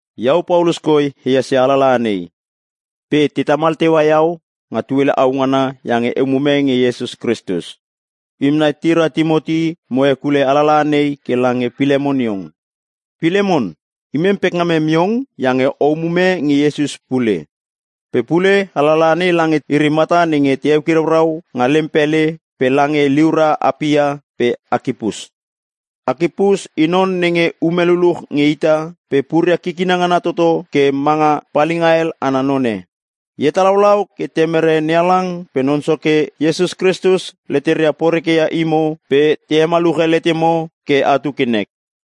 Iau Paulus koi ehas ia alalaha nei. Pe te tamal teua iau nga tuele au ngana iange e umume nge Iesus Kristus. Imem nai tira Timoti mo hekule alalaha nei ke lange Pilemon iong. Pilemon, imem pekngamem iong iange o umume nge Iesus pule. Pe pule alalaha nei lange iri mata nenge te eukiraurau nga lem pele pe lange liura Apia pe Akipus. Akipus i non nenge ume luluch nge ita pe puria kikina ngana toto ke manga palinga hel ana none. E hetalaulau ke Temere NeHalang pe Non Soke Iesus Kristus leteria porekeia imo pe te hemaluche letemo ke atu ke nek.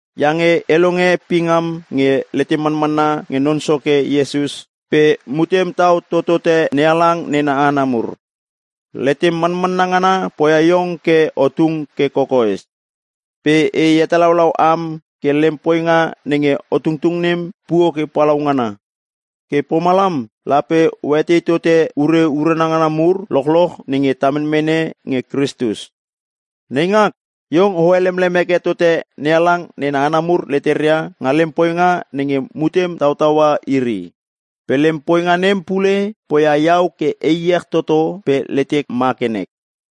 iange e longe pingam nge letem manmanna nge Non Soke Iesus pe mutem tau totote NeHalang nena hana mur. Letem manmanna ngana poia iong ke o tung ke kokoes. Pe e hetalaulau am ke lem poinga nenge o tungtung nem puo ke palaungana. Ke pomalam lape oetei tote ure urana ngana mur lochloch nenge ta menmene nge Kristus. Neingak, iong o helemlem heke tote NeHalang nena hana mur leteria nga lem poinga nenge mutem tautaua iri. Pe lem poinga nem pule, poia iau ke e iech toto pe letek ma ke nek.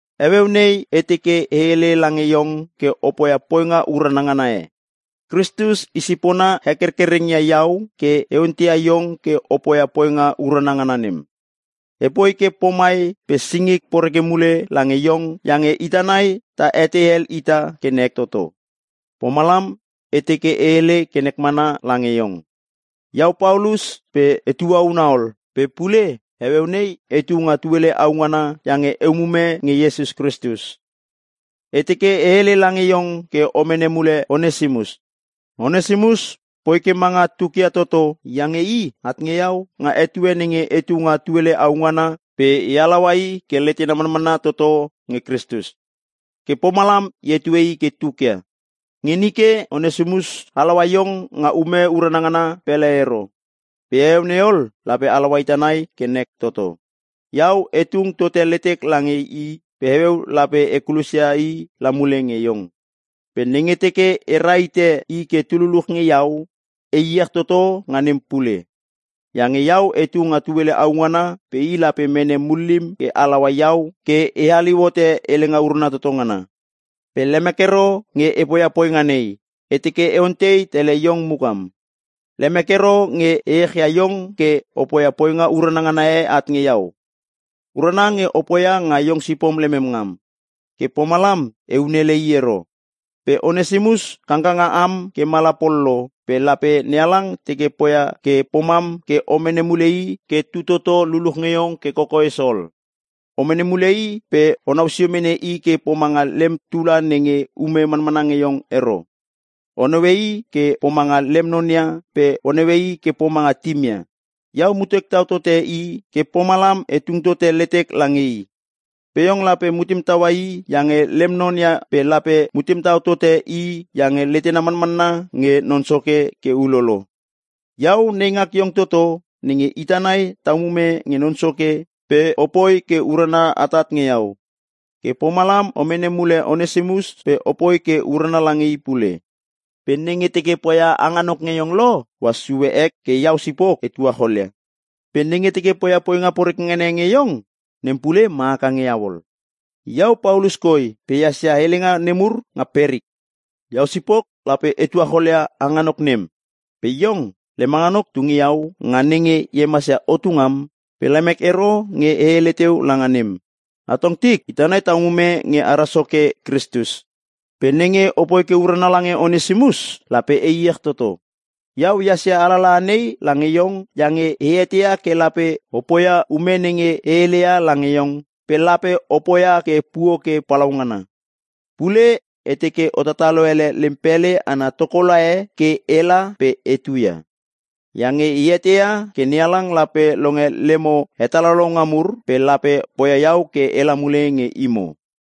Heueu nei e teke e hele lange iong ke o poia poinga urana ngana e. Kristus i sipona hekerkereng ia iau ke e onteia iong ke o poia poinga urana ngana nem. E poi ke pomai pe singik poreke mule lange iong iange ita nai ta etei hel ita ke nek toto, pomalam e teke e hele ke nek mana lange iong. Iau Paulus pe e tuauna ol, pe pule heueu nei etu nga tuele au ngana iange e umume nge Iesus Kristus. E teke e hele lange iong ke o mene mule Onesimus. Onesimus poi ke manga tukia toto, iange i at nge iau nga etue nenge etu nga tuele au ngana pe e halaua i ke letena manmanna toto nge Kristus. Ke pomalam e hetue i ke tukia. Nge nike Onesimus halaua iong nga ume urana ngana pele ero, pe heueu nei ol lape halaua ita nai ke nek toto. Iau e tung tote letek lange i pe heueu lape e kulosia i la mule nge iong. Pe nenge teke e rahite i ke tu luluch nge iau, e iech toto nga nem pule. Iange iau etu nga tuele au ngana pe i lape mene mullim ke halaua iau ke e haliu hote Helenga Urana Toto Ngana. Pe lemek ero nge e poia poinga nei, e teke e ontei tele iong mukam. Lemek ero nge e echia iong ke o poia poinga urana ngana e at nge iau. Urana nge o poia nga iong sipom lemem ngam. Ke pomalam eun ele i ero. Pe Onesimus kangkanga am ke mala pol lo pe lape NeHalang teke poia ke pomam ke o mene mule i ke tu toto luluch nge iong ke kokoes ol. O mene mule i pe o nausio mene i ke pomanga lem tula nenge ume manmana nge iong ero. O naue i ke pomanga lem non ia pe o naue i ke pomanga tim ia. Iau mutek tau tote i ke pomalam e tung tote letek lange i. Pe iong lape mutem taua i iange lem non ia pe lape mutem tau tote i iange letena manmanna nge Non Soke ke ulolo. Iau neingak iong toto nenge ita nai ta umume nge Non Soke pe opoi ke urana atat nge iau. Ke pomalam o mene mule Onesimus pe opoi ke urana lange i pule. Pe nenge teke poia hanganok nge iong lo, ohas sue ek ke iau sipok e tuacholia. Pe nenge teke poia poinga poreke ngana e nge iong, nem pule ma haka nge iau ol. Iau Paulus koi pe ehas ia helenga nemur nga perik. Iau sipok lape e tuacholia hanganok nem. Pe iong, lem hanganok tu nge iau nga nenge e hemasia otu ngam, pe lemek ero nge e hele teu langa nem. Atong tik, ita nai ta umume nge ara Soke Kristus. Pe nenge opoi ke urana lange Onesimus, lape e iech toto. Iau ehas ia alalaha nei lange iong iange e eteia ke lape o poia ume nenge e heleia lange iong, pe lape o poia ke puo ke palaungana. Pule e teke o tatalo ele lem pele ana tokola e ke ela pe etuia. Iange eteia ke NeHalang lape longe lemo hetalaulaunga mur pe lape poia iau ke ela mule nge imo.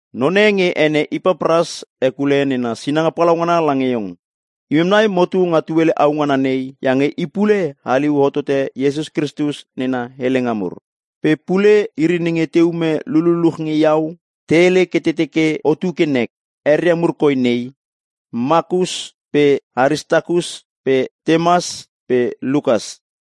None nge ene Ipapras hekule nena sinanga palaungana lange iong. Imem nai motu nga tuele au ngana nei iange i pule haliu hotote Iesus Kristus nena helenga mur. Pe pule iri nenge te ume lululuch nge iau te hele ke te teke otu ke nek. Eria mur koi nei: Makus pe Aristakus pe Temas pe Lukas.